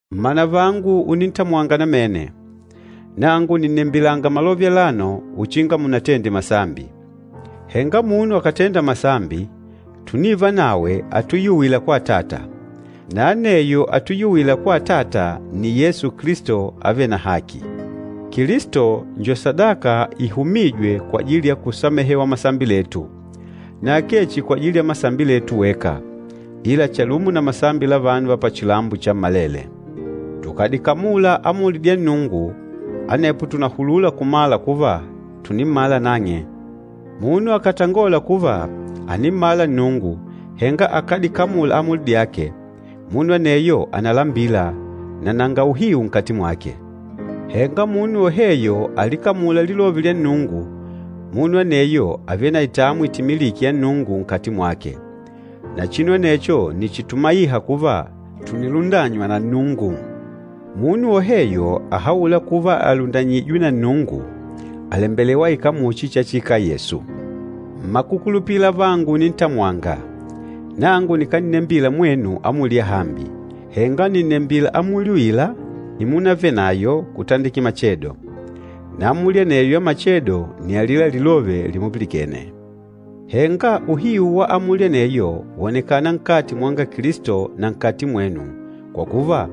Mmanavangu unintamwanga namene, nangu nìnnembilanga malove alano uchinga munatende masambi. Henga munu akàtenda masambi, tùnivanawe atuyuwîla kwa Atata. Na aneyo atuyuwîla kwa Atata nni Yesu Kilisto avêle na haki. Kilisto njo sadaka ihumîjwe kwajili ya kusamehewa masambi letu, na akee chihi kwajili ya masambi letu weka, ila chalumo na masambi la vanu va pachilambo chammalele. Tukàdikamula amuli dya Nnungu, anepo tùnahulula kumala kuva tùnimmala nang'e. Munu akàtangola kuva, ànimmala Nnungu, henga akádikamula amuli dyake, munu aneyo ànalambila, na nanga uhiu nkati mwake. Henga munu woheyo alikamûla lilove lya Nnungu, munu aneyo àvele na itamwi itimilîke ya Nnungu, nkati mwake. Na chinu anecho nni chitumaîha kuva tùnilundanywa na Nnungu. Munu woheyo ahaûla kuva àlundanyijwe na Nnungu, àlembelewa aikale muchi chachiikala Yesu. Mmakukulupila avangu unintamwanga, nangu nikánnembila mwenu amuli yahambi, henga nìnnembila amuli uila imunavenayo kutandikila machedo. Na amuli aneyo ya machedo nni alila lilove limupilikene. Henga uhiu wa amuli aneyo wonekana nkati mwanga Kilisto na nkati mwenu, kwa kuva,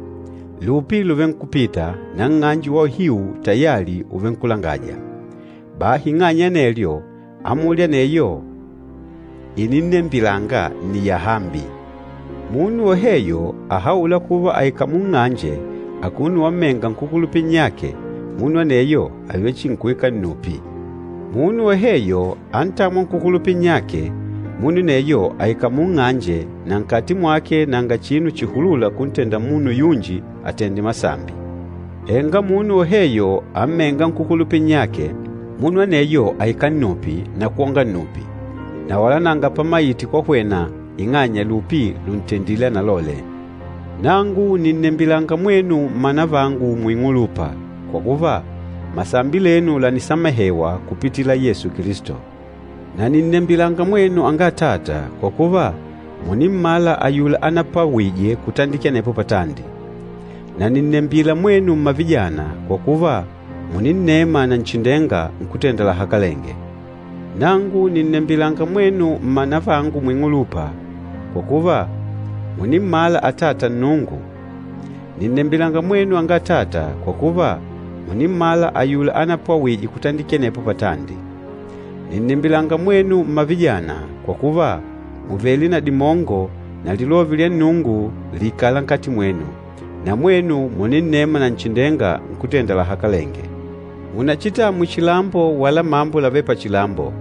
lupi lùvenkupita na nng'anje wa uhiu tayali ùvenkulangaja. Bahi ing'anya ya anelyo, amuli aneyo ininnembilanga nni yahambi. Munu woheyo ahaûla kuva àikala munng'anje akuno wammenga nkúkulupila nnyake, munu aneyo àvele chihi nkuikala nnupi. Munu woheyo antâmwa nkúkulupila nnyake, munu aneyo àikala munng'anje na nkati mwake nanga chinu chihulula kuntenda munu yunji àtende masambi. Henga munu woheyo ammênga nkúkulupila nnyake, munu aneyo àikala nnupi na kwonga nnupi, na wala nanga pamaite kwahwena ing'anya lupi lùntendile analole. Nangu nìnnembilanga mwenu mmanavangu muing'ulupa, kwa kuva, masambi lenu lànisamehewa kupitila Yesu Kilisto. Na nìnnembilanga mwenu anga atata, kwa kuva, mùnimmala ayula anapwawîje kutandikila anepo patandi. Na nìnnembila mwenu mmavijana, kwa kuva, mùninnema Nanchindenga, Nkútenda lahakalenge. Nangu nìnnembilanga mwenu mmanavangu muing'ulupa, kwa kuva, mùnimmala Atata Nnungu. Nìnnembilanga mwenu anga atata, kwa kuva, mùnimmala ayula anapwawîje kutandikila anepo patandi. Nìnnembilanga mwenu mmavijana, kwa kuva, mùvele na dimongo na Lilove lya Nnungu lìikala nkati mwenu, na mwenu mùninnema Nanchindenga, Nkútenda lahakalenge. Munachitamwe chilambo wala mambo lavêle pachilambo.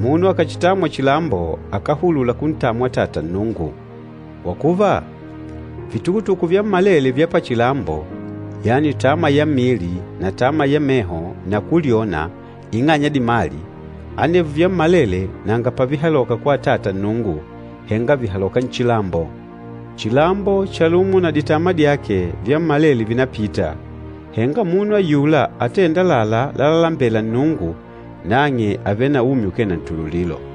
Munu akàchitamwa chilambo, akáhulula kuntamwa Atata Nnungu. Kwa kuva, vitukutuku vyammalele vya pachilambo, yani tama ya mmili na tama ya meho na kulyona ing'anya ya dimali, anevyo vyammalele nanga pavihaloka kwa Atata Nnungu, henga vìhaloka nchilambo. Chilambo chalumo na ditama dyake, vyammalele vìnapita, henga munu ayula atênda àlalá lalalembela Nnungu, nang'e àvele na umi ukee na ntululilo.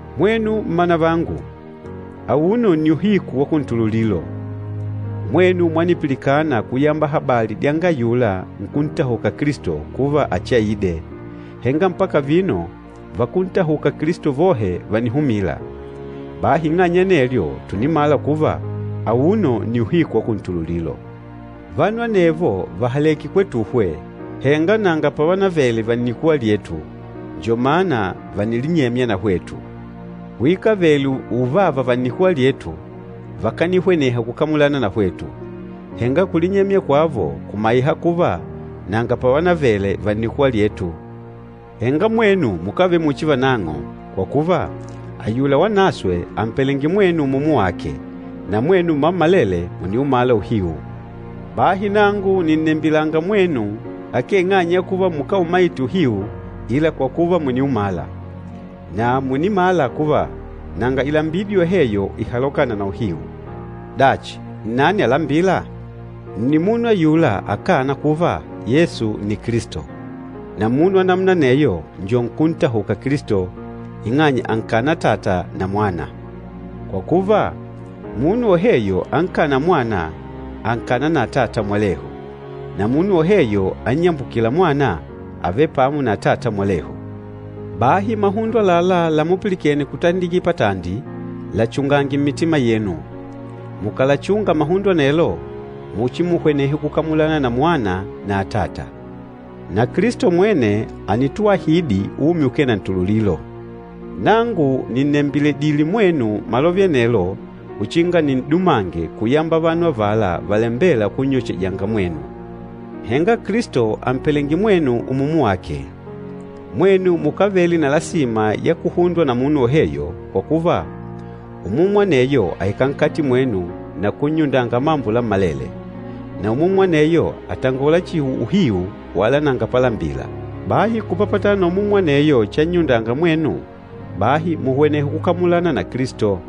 Mwenu mmanavangu, auno nni uhiku wa kuntululilo! Mwenu mwanipilikana kuyamba habali dyanga ayula nkúntahuka Kilisto kuva achiaide, henga mpaka vino vakúntahuka Kilisto vohe vànihumila. Bahi ing'anya ya anelyo tùnimala kuva, auno nni uhiku wa kuntululilo. Vanu anevo vàhaleke kwetuhwe, henga nanga pavanavele va nnikuwa lyetu, njo mana vànilinyemya na hwetu. Kuikavele uvava va nnikuwa lyetu, vakanihweneha kukamulana na hwetu. Henga kulinyemya kwavo kumaiha kuva nanga pavanavele va nnikuwa lyetu. Henga mwenu mukávele muchi vanang'o, kwa kuva, ayula Wanaswe àmpelenge mwenu Umumu wake, na mwenu mmammalele mùniumala uhiu. Bahi nangu nìnnembilanga mwenu akee ing'anya ya kuva mukáumaite uhiu ila kwa kuva mùniumala. Na mùnimala kuva nanga ilambidi yoheyo ihalokâna na uhiu. Dachi, nnani alambîla? Nni munu ayula akâna kuva, Yesu nni Kilisto. Na munu wa namuna aneyo njo nkúntahuka Kilisto, ing'anya ànkana Atata na Mwana. Kwa kuva, munu woheyo ankâna Mwana, ànkana na Atata mwalehu, na munu woheyo annyambukîla Mwana, àvele pamo na Atata mwalehu. Bahi mahundo àlalá lamupilikene kutandikila patandi, lachungange mmitima yenu. Mukàlachunga mahundo anelo, muchimuhwenehe kukamulana na Mwana na Atata. Na Kilisto mwene ànituahidi umi ukee na ntululilo. Nangu nìnnembiledile mwenu malove anelo uchinga nin'dumange kuyamba vanu avala valambêla kunnyochejanga mwenu. Henga Kilisto àmpelenge mwenu Umumu wake. Mwenu mukávele na lasima ya kuhundwa na munu woheyo, kwa kuva, Umumu aneyo àikala nkati mwenu na kunnyundanga mambo lammalele. Na Umumu aneyo àtangola chihi uhiu wala nanga palambila. Bahi kupapatana na Umumu aneyo channyundanga mwenu, bahi muhwenehe kukamulana na Kilisto.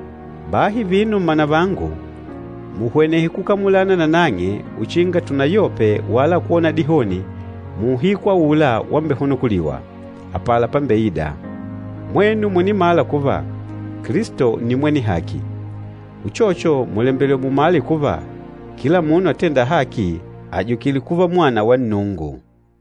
Bahi vino mmanavangu, muhwenehe kukamulana nanang'e uchinga tunayope wala kwona dihoni muuhiku aula wambehunukuliwa, apala pambeida. Mwenu mùnimala kuva, Kilisto nni mwene haki, uchocho mùlembelewa mumale kuva, kila munu atênda haki àjukile kuva mwana wa Nnungu.